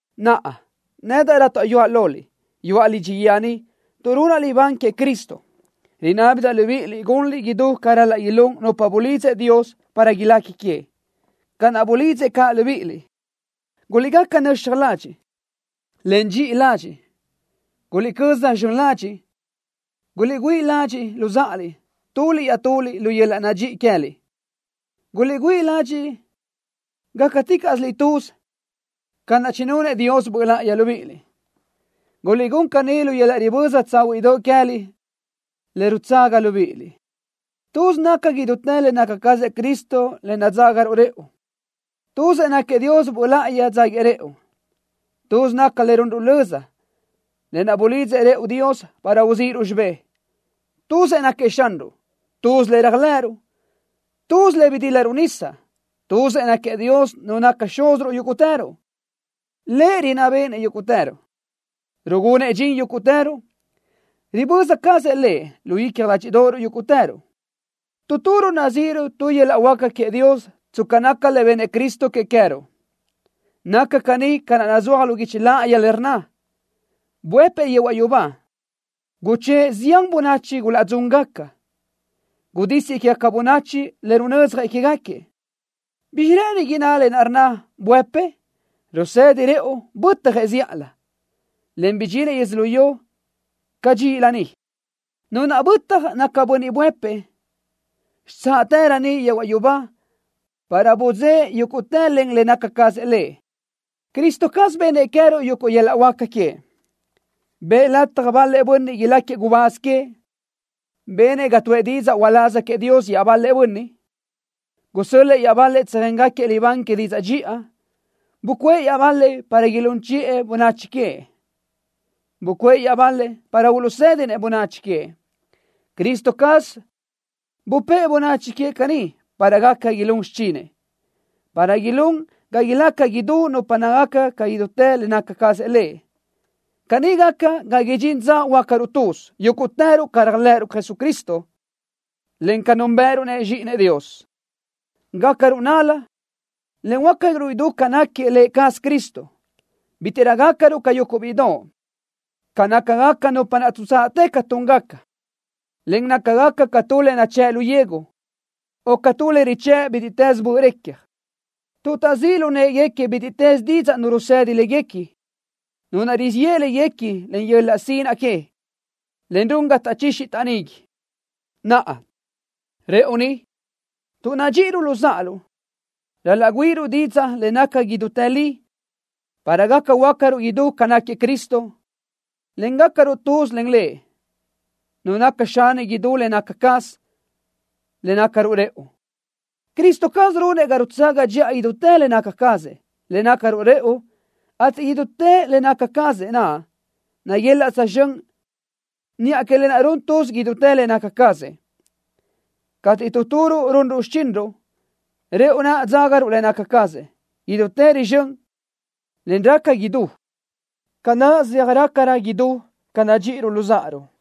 Naʼa, nedaʼ rátaʼyuaʼ loliʼ, yuʼa lidxi guíë ni tuʼ runaʼ libán queëʼ Cristo, rinábidaʼ libíʼiliʼ gunliʼ idú ca ral-laʼ ilún nupa bulidzëʼ Dios para ilequi queëʼ, ca naʼ bulidzëʼ caʼ libíʼiliʼ. Guliʼgaca nöxaj ladxiʼ, en dxiʼi ladxiʼ. Guliʼcö́z zxön ladxiʼ. Guliʼgüíʼ ladxiʼ luzáʼaliʼ tuliʼ iaʼtuliʼ lu yöl-laʼ nadxíʼi queë́liʼ. Guliʼgüíʼ ladxiʼ gácaticaʼsiliʼ tuz ca naʼ chinunëʼ Dios Böʼ Láʼayi libíʼiliʼ, gunliʼ caní lu yöl-laʼ riböza tsáhuiʼdoʼ queë́liʼ le rutsaga libíʼiliʼ. Tuz naca idútë le naca cazëʼ Cristo le nadzágaruʼ rëʼu. Tuzëʼ náquiëʼ Dios Böʼ Láʼayi dzáguiëʼ rëʼu. Tuz naca le runruʼ löza, lë naʼ bulidzëʼ rëʼu Dios para uzíʼiruʼ xibé. Tuzëʼ náquiëʼ Xanruʼ. Tuz le réajlëʼëruʼ. Tuz le bidílaruʼ nisa. Tuzëʼ náquiëʼ Dios Nu naca Xúziruʼ yúguʼtëruʼ. Lëʼ rinná béʼenëʼ yúguʼtëruʼ. Rugunëʼ dxin yúguʼtëruʼ. Riböza cazëʼ Lëʼ lu icja ládxiʼdoʼoruʼ yúguʼtëruʼ. Tu turuʼ nazíʼiruʼ tu yöl-laʼ huáca queëʼ Dios tsca naca le bennëʼ Cristo que queë́ruʼ. Naca caní ca naʼ nazúaj lu guichi láʼayi le rnna: Buëpëʼ yehuaʼ yubá, guchë́ʼë zián bönachi gulaʼdzúngaca. Gudísiëʼ quégaca bönachi le runö́dzjasëʼ quégaquiëʼ. ¿Bizxi rë́ʼëni inná lë naʼ rnna: buëpëʼ? Rusëdi rëʼu bötjëʼ zíʼalö, en bidxinëʼ yödzölió cadxíʼilö ni. Nu naʼ bötaj naca Bönniʼ naʼ buëpëʼ xitsáʼtërö niʼ yehuaʼ yubá para budzë́ʼë yúguʼtë len le naca cazëʼ Lëʼ. Cristo caz bennëʼ que queë́ruʼ yuguʼ yöl-laʼ huáca queëʼ: Bëʼ lataj bal-lëʼ bönniʼ iláquiëʼ gubáz queëʼ. Benëʼ ga tuʼë didzaʼ uláz queëʼ Dios iaʼbal-lëʼ bönniʼ. Gusö́l-lëʼë iaʼbal-lëʼ tsöjéngaquiëʼ libán que didzaʼ dxiʼa. Bucuʼë iaʼbal-lëʼ para ilún chiʼë bönachi queëʼ. Bucuʼë iaʼbal-lëʼ para uluʼsë́dinëʼ bönachi queëʼ. Cristo caz bupë́ʼë bönachi queëʼ caní para gaca ilún xichinëʼ, para ilún ga ilaca idú nupa nácagaca ca idútë le naca cazëʼ Lëʼ. Caní gaca ga idxintë dza huöácaruʼ tuz yúguʼtëruʼ ca réajlëʼëruʼ Cristo, en ca núnbëʼëruʼ-nëʼ Zxíʼinëʼ Dios. Gácaruʼ nál-la, en huöácaruʼ idú ca náquiëʼ Lë cazëʼ Cristo. Bítiʼrö gácaruʼ ca yuguʼ bíʼidoʼ, ca nácagaca nupa naʼ tuʼtsaʼtë ca túngaca, en nácagaca ca tu le nachë́ʼ lu yegu, o ca tu le röjchë́ʼ bítiʼtës böʼ recja, tuʼ taʼzíʼ lu në́ʼeguequi bítiʼtës didzaʼ nu rusëdi léguequi, nu naʼ rizíʼ yeʼe léguequi len yöl-laʼ sinaʼ que, en run ga taʼchixi taʼnigui. Naʼa, rëʼu ni, tuʼ nadxíʼiruʼ luzáʼaruʼ, ral-laʼ güíʼiruʼ didzaʼ le naca idútë li para gaca huöácaruʼ idú ca náquiëʼ Cristo, en gácaruʼ tuz len Lëʼ, Nu naca Xani idú le naca cazëʼ, le nácaruʼ rëʼu. Cristo caz runëʼ ga rutsaga dxiʼa idútë le naca cazëʼ, le nácaruʼ rëʼu, ateʼ idútë le naca cazëʼ naʼ naguelaʼ tsözxö́n niʼa que lë naʼ run tuz idútë le naca cazëʼ. Cateʼ tu turuʼ runruʼ xichinruʼ, rëʼu naʼ dzágaruʼ le naca cazëʼ, idútë rizxö́n, en raca idú, ca naʼ zeaj rácarö idú ca nadxíʼiruʼ luzáʼaruʼ.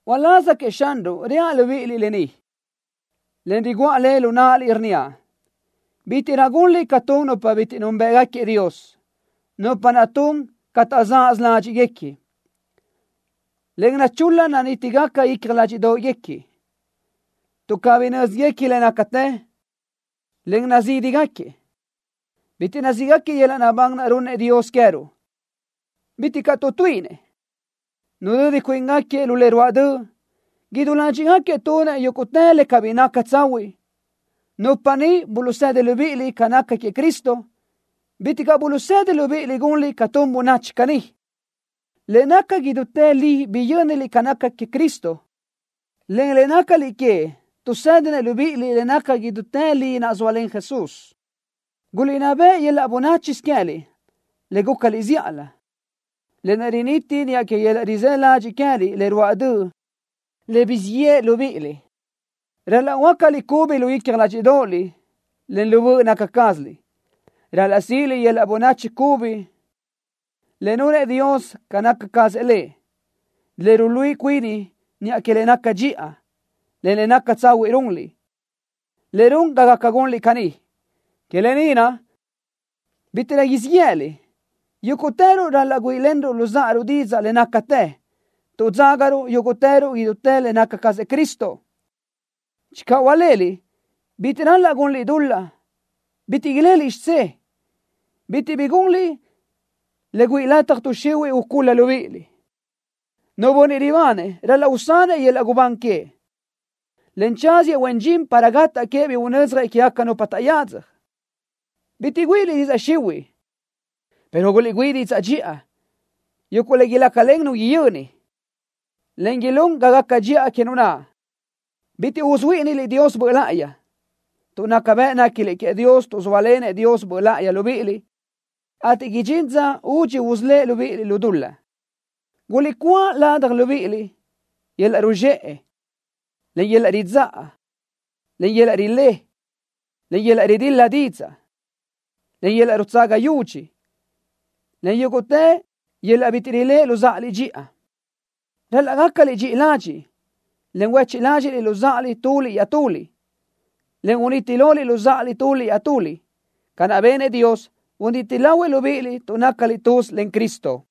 Uláz queëʼ Xanruʼ reaʼ libíʼiliʼ lë ni, en riguʼa le lu náʼaliʼ, rnníaʼ: Bítiʼrö gunliʼ ca tun nupa bitiʼ núnbëʼgaquiëʼ Dios, nupa naʼ tun ca taʼzaʼsö ládxiʼguequi, en nachul-la nanítigaca icja ládxiʼdoʼguequi. Tuʼ cabí nö́zguequinëʼ le nácatë, en nazídigaquiëʼ, bitiʼ nazíʼgaquiëʼ yöl-laʼ naʼbán naʼ runnëʼ Dios queë́ruʼ. Bitiʼ caʼ tuʼtuíʼinëʼ. Nudödi cuíngaquiëʼ lu le ruáʼ döʼ. Idú ládxiʼgaquiëʼ tunëʼ yúguʼtë le cabí naca tsahuiʼ. Nupa niʼ buluʼsedi libíʼiliʼ ca naca queëʼ Cristo, bitiʼ caʼ buluʼsedi libíʼiliʼ gunliʼ ca tun bönachi caní. Le naca idútë li biyö́niliʼ ca naca queëʼ Cristo, en le nácaliʼ queëʼ tuʼsédinëʼ libíʼiliʼ le naca idútë li naʼ zóalen Jesús. Guliʼnná beʼe yöl-laʼ bönáchisö queë́liʼ le gúcaliʼ zíʼalö, lë naʼ riniti niʼa que yöl-laʼ rizë́ ladxiʼ queë́liʼ le ruáʼ döʼ le guzxíʼ yeʼe libíʼiliʼ. Ral-laʼ huöácaliʼ cubi lu icja ládxiʼdoʼoliʼ, en lu böʼ naca cázaliʼ. Ral-laʼ síʼiliʼ yöl-laʼ bönachi cubi le nunëʼ Dios ca naca cazëʼ Lëʼ, le ruluíʼi cuini niʼa que le naca dxiʼa, en le naca tsahuiʼ runliʼ, en run ga gaca gunliʼ caní. Que lë ni naʼ, bítiʼrö siʼ yë́ʼëliʼ. Yúguʼtëruʼ ral-laʼ güíʼilenruʼ luzáʼaruʼ didzaʼ le nácatë, tuʼ dzágaruʼ yúguʼtëruʼ idútë le naca cazëʼ Cristo. Channö hualéliʼ, bitiʼ ral-laʼ gunliʼ dul-laʼ. Bitiʼ ileliʼ xidzé. Bitiʼ bi gunliʼ le güíʼi lataj tuʼ xihuiʼ ucúl-la libíʼiliʼ. Nu bönniʼ ribanëʼ ral-laʼ usanëʼ yöl-laʼ gubán queëʼ, en tsáziëʼ huen dxin para gataʼ queëʼ bi unödzjëʼ quégaca nupa taʼyadzaj. Bitiʼ güíʼiliʼ didzaʼ xihuiʼ, pero guliʼgüíʼ didzaʼ dxiʼa, yuguʼ le ilácalen nu yöni, en ilún ga gaca dxiʼa que nu naʼ. Bitiʼ usuhuíʼiniliʼ Dios Böʼ Láʼayi, tuʼ naca bëʼ néquiliʼ queëʼ Dios tuʼ zóalenëʼ Dios Böʼ Láʼayi libíʼiliʼ, ateʼ idxín dza údxi usölë́ʼ libíʼiliʼ lu dul-laʼ. Guliʼcúa ladaj libíʼiliʼ yöl-laʼ ruzxëʼe, en yöl-laʼ ridzáʼa, en yöl-laʼ rilé, en yöl-laʼ ridil-la didzaʼ, en yöl-laʼ rutsaga yudxi, en yúguʼtë yöl-laʼ bitiʼ riléʼe luzáʼaliʼ dxiʼa. Ral-laʼ gácaliʼ dxiʼi ladxiʼ, en huéchiʼ ládxiʼliʼ luzáʼaliʼ tuliʼ iaʼtuliʼ, en uniti loliʼ luzáʼaliʼ tuliʼ iaʼtuliʼ, ca naʼ benëʼ Dios, buniti lahuëʼ libíʼiliʼ tuʼ nácaliʼ tuz len Cristo.